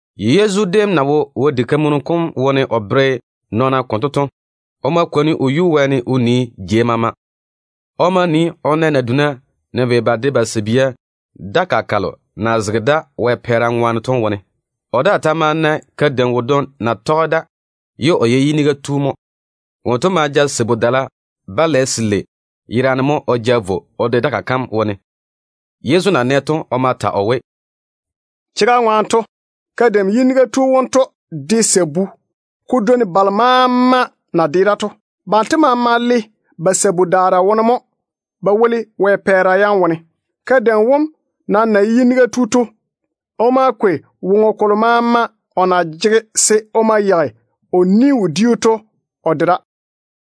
Yezu déem na wo Wɛ diga kam wone o bere nɔɔna konto to, o ma kwoni o yuu wɛɛne o nii jei maama. O ma na naduna na vei ba de ba sabia Wɛ pɛɛra dakaa kam wone. O daa ma na kadeim wodwoŋi na tɔge da ye o ye yiniga tu mo. Wonto ma ja sabu-dala-balɛ selei yerane mo o ja vo o de dakaa kam wone. Yezu na nɛ to, o ma ta o we, “Chega ŋwaane to, kadeim yiniga tu wonto de sabu ko dwoi balo maama na de da to. Banto maama le ba sabu-daara wone mo ba woli Wɛ pɛɛra yam wone. Kadeim wom nam na ye yiniga tu to, o ma kwei woŋo kolo maama o na jege se o ma yeigi o ni-wodiu to o de da.”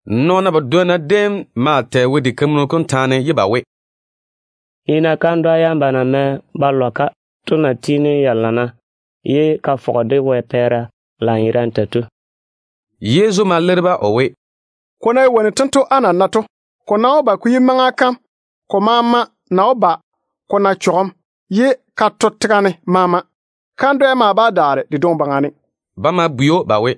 Nɔɔna badwonna déem maa tɛ Wɛ diga kam taane ye ba we, “Nii-na kandwa yam ba na mɛ ba lɔ-ka to na tiini ya lana ye Wɛ pɛɛra de fɔge-ka lanyerane tei to.” Yezu ma leiri-ba o we, “Ko ná ye wonnu tento á na nae to, ko nam wó ba ko yi maŋa kam ko maama na wó ba ko to ko saare tega ne. Kandwɛ daa bá daare de dwoŋi baŋa ne.” Ba ma bwei‑o ba we,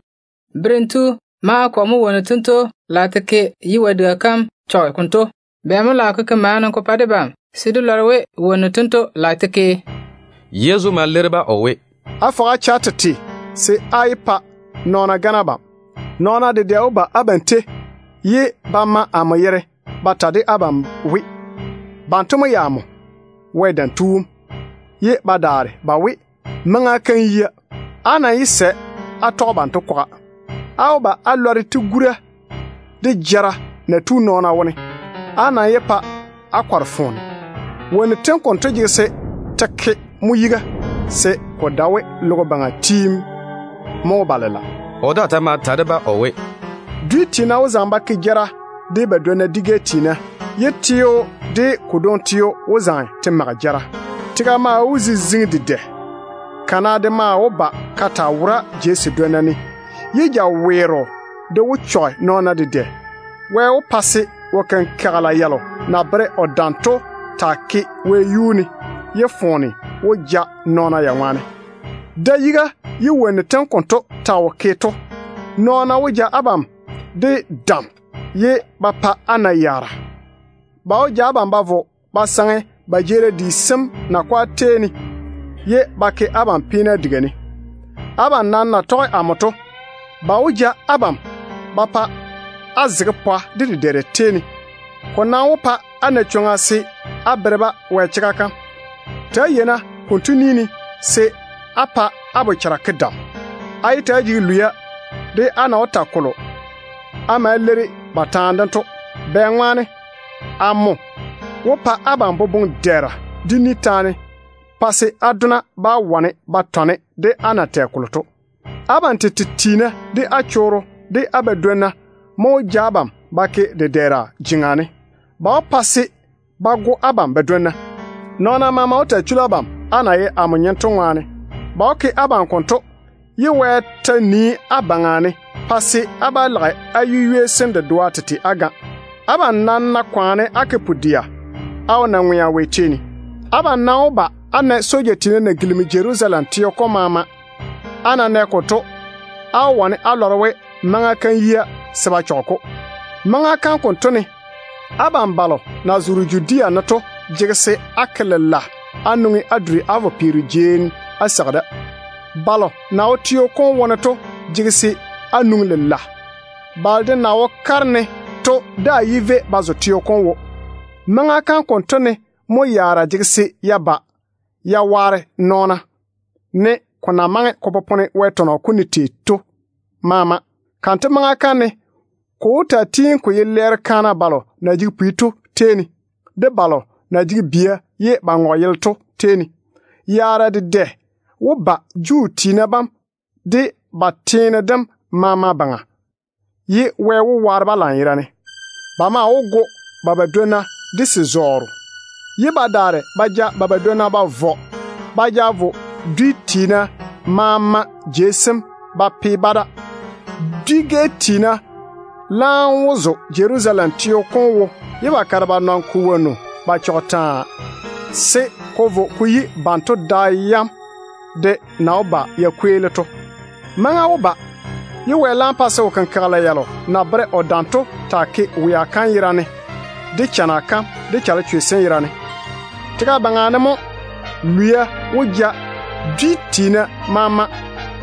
“Berem tu, maŋa kɔ mo wonnu tento lage te ke ye Wɛ diga kam chɔge konto? Bɛ mo lage ko ke maana ko pa debam se dé lɔre we wonnu tento lage te ke?” Yezu ma leiri-ba o we, “Fɔge-na á che á tete se á yé pa nɔɔna gane abam. Nɔɔna dedɛ wó ba abam tei ye ba ma amo yere ba we, banto mo ye amo, Wɛ Dam Tu wom, ye ba daare ba we, maŋa kam yia. Á nam yé sɛ á tɔge banto kwaga. Á wó ba á lɔre tigura de jara na tu nɔɔna wone. Á nam yé pa á kɔre foone. Wonnu tem konto jege se te ke mo yiga, se ko dae we logo baŋa tiim mo wó ba lela.” O daa ta ma ta de-ba o we, “Dwi tiina wó zaŋe ba ke jara de ba dwonna dwi-gɛ tiina, ye teo de ko dwoŋi teo wó zaŋe te mage jara. Tega maa wó ziziŋi dedɛ. Kana de wó ba ka taa wora jei sedwonna ne, ye jaweero de wó chɔge nɔɔna dedɛ. Wɛ wó pa se wo-kenkagela yalo na bere o dam to taa ke wɛyuu ne, ye foone wó ja nɔɔna ya ŋwaane. Da-yiga ye wonnu tem konto ta wo ke to, nɔɔna wó zi abam de dam ye ba pa á na yaara. Ba wó ja abam ba vo ba saŋe ba jeerim di sem nakwa tei ne, ye ba ke abam peena diga ne. Abam nam na tɔge amo to, ba wó ja abam ba pa á zege pwa de dedɛɛra tei ne. Ko nam wó pa á na chwoŋa se á bere-ba Wɛ chega kam. Ta‑á yei-na konto ni ne se á pa á bochara ke dam. Á yé ta‑á jege lwia de á na wó ta kolo á ma leiri ba taane dem to. Bɛŋwaane amo wó pa abam boboŋ-dɛɛra de ni taane, pa se á dona bá wane ba tɔne de á na wó ta kolo to. Abam tete tiina, de á chorro, de á badwonna mo wó ja abam ba ke dedɛɛra jeŋa ne. Ba wó pa se ba go abam badwonna. Nɔɔna maama wó taa chuli abam, á na ye amo nyem to ŋwaane. Ba wó ke abam konto ye Wɛ ta nii á baŋa ne, pa se á yu-ywei sem dedoa tete bá jei. Abam nam ná kwaane á ke pu-dɛa, á wó na ŋwea Wɛ tei ne. Abam nam wó ba á na soja tiina na gilimi Jerusalem teo kom maama ba pu. Á ná nɛ konto, á wó wane á lɔre we maŋa kam yia se ba chɔge-ko. Maŋa kam konto ne, abam balo na zoore Judea ne to jege se á ke lela á nwoŋi á duri á vo peero jei á seigi da. Balo na wo teo kom wone to jege se á nwoŋi lela. Balo de na wo ba kare ne to daa yé vei ba zo teo kom wo. Maŋa kam konto ne mo yaara jege se ya ba ya waare nɔɔna, ne ko na maŋe ko popone Wɛ tɔnɔ kom ne tei to maama. Kanto maŋa kam ne ko wó tiini ko taa ye lɛɛro kaana balo na jege pwi to tei ne, de balo na jege bia ye ba ŋɔge yele to tei ne. Chanɛɛre dedɛ wó ba Juu tiina bam de ba tega kam maama baŋa, ye Wɛ wó waare-ba lanyerane. Ba maa wó go ba badwonna de se-zɔɔro, ye ba daare ba ja ba badwonna ba vɔ ba ja vo sa-teene maama ba pe-ba da. Dwi-gɛ tiina laam wó zo Jerusalem teo kom wo, ye ba kare ba nɔne ko wonnu ba chɔge taa, se ko vo ko yi banto da yam de na wó ba ya kweeli to. Maŋa wó ba ye Wɛ laam pa se wo-kenkagela yalo na bere o dam to taa ke wea kam yera ne, de chana kam, de chalechwe sem yera ne. Tega baŋa ne mo lwia wó ja dwi tiina maama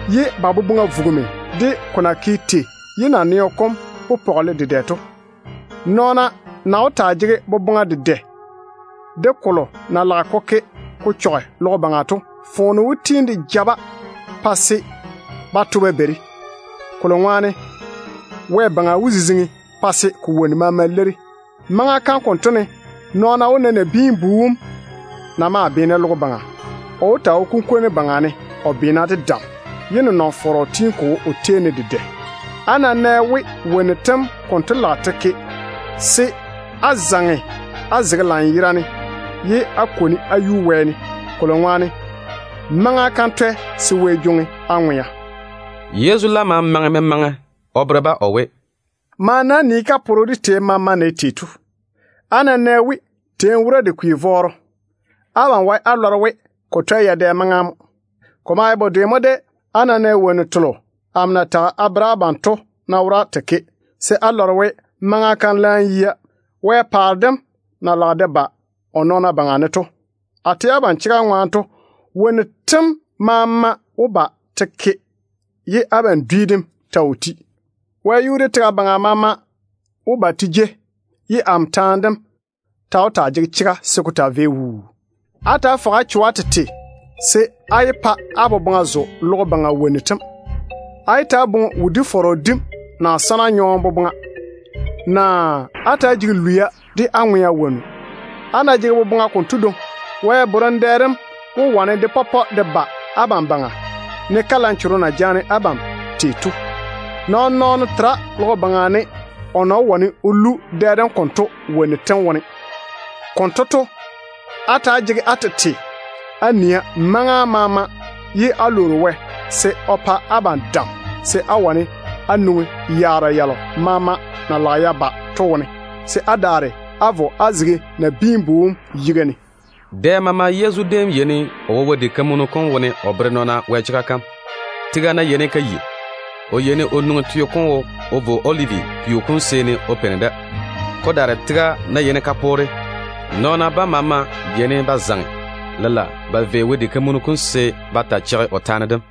ye ba boboŋa vugimi de ko na ke tei ye naneo kom pɔgele dedɛ to. Nɔɔna na wó taa jege boboŋa dedɛ de kolo na lage ko ke ko chɔge logo baŋa to, foone wó tiini de ja-ba pa se ba to ba beiri, kolo ŋwaane wɛ-baŋa wó ziziŋi pa se ko wonnu maama leiri. Maŋa kam konto ne nɔɔna wó na Nabiin-bu wom na maa beene logo baŋa. O wó taa wo kunkwoŋo baŋa ne o beena de dam, ye nenɔŋ-fɔrɔ tiini ko wo o tei ne dedɛ. Á ná nɛ we wonnu tem konto lage te ke, se á zaŋe á zege lanyerane ye á kwoni á yuni wɛɛne, kolo ŋwaane maŋa kam twɛ se Wɛ jwoŋi á ŋwea.” Yezu laam ma maŋe memaŋe o bere-ba o we, “Maane-na á nii kaporo de teeni maama na ye tei to. Á ná nɛ we teeni wora de kwi vɔɔro, abam wae á lɔre we ko twɛ yadɛ maŋa mo. Ko maa ye bedwe mo de á ná nɛ wonnu telo amo na tage a bere abam to ná wora te ke, se á lɔre we maŋa kam laam yia Wɛ paare dem na lage de ba o nɔɔna baŋa ne to. A tɛ abam chega ŋwaane to, wonnu tento tem maama wó ba te ke, ye abam dwi dem ta wo ti. Wɛyuu de tega baŋa maama wó ba te jei, ye amo taane dem ta wó taa jege chega se ko taa vei wuu. Ta‑á fɔge-na á cho á tete se á yé pa á boboŋa zo logo baŋa wonnu tem. Á yé ta‑á boŋe wodi-fɔrɔ dim na sana nyɔɔm boboŋa, naa á ta‑á jege lwia de á ŋwea wonnu. Á ná jege boboŋa konto dwoŋi, Wɛ borem dɛ dem wó wane de pɔpɔ de ba abam baŋa, ne kalanchogo na jaane abam tei to. Nɔɔn-nɔɔno tera logo baŋa ne o na wó wane o lu dɛ dem konto kikia yam wone. Konto to, á ta‑á jege á tete á nia maŋa maama, ye á lwoori Wɛ se o pa abam dam se á wane á nwoŋi yaara yalo maama na lage ya ba to wone, se á daare á vo á zege Nabiin-bu wom yiga ne.” Dɛ maama Yezu déem yeini o wo Wɛ diga kam wone o bere nɔɔna Wɛ chega kam. Tega ná yeini ka yi, o yeini o nwoŋi teo kom wo o vo Olivi peo kom seeni o peini da. Ko daare tega ná yeini ka poore, nɔɔna bam maama yeini ba zaŋe lela ba vei Wɛ diga kam se ba taa cheigi o taane dem.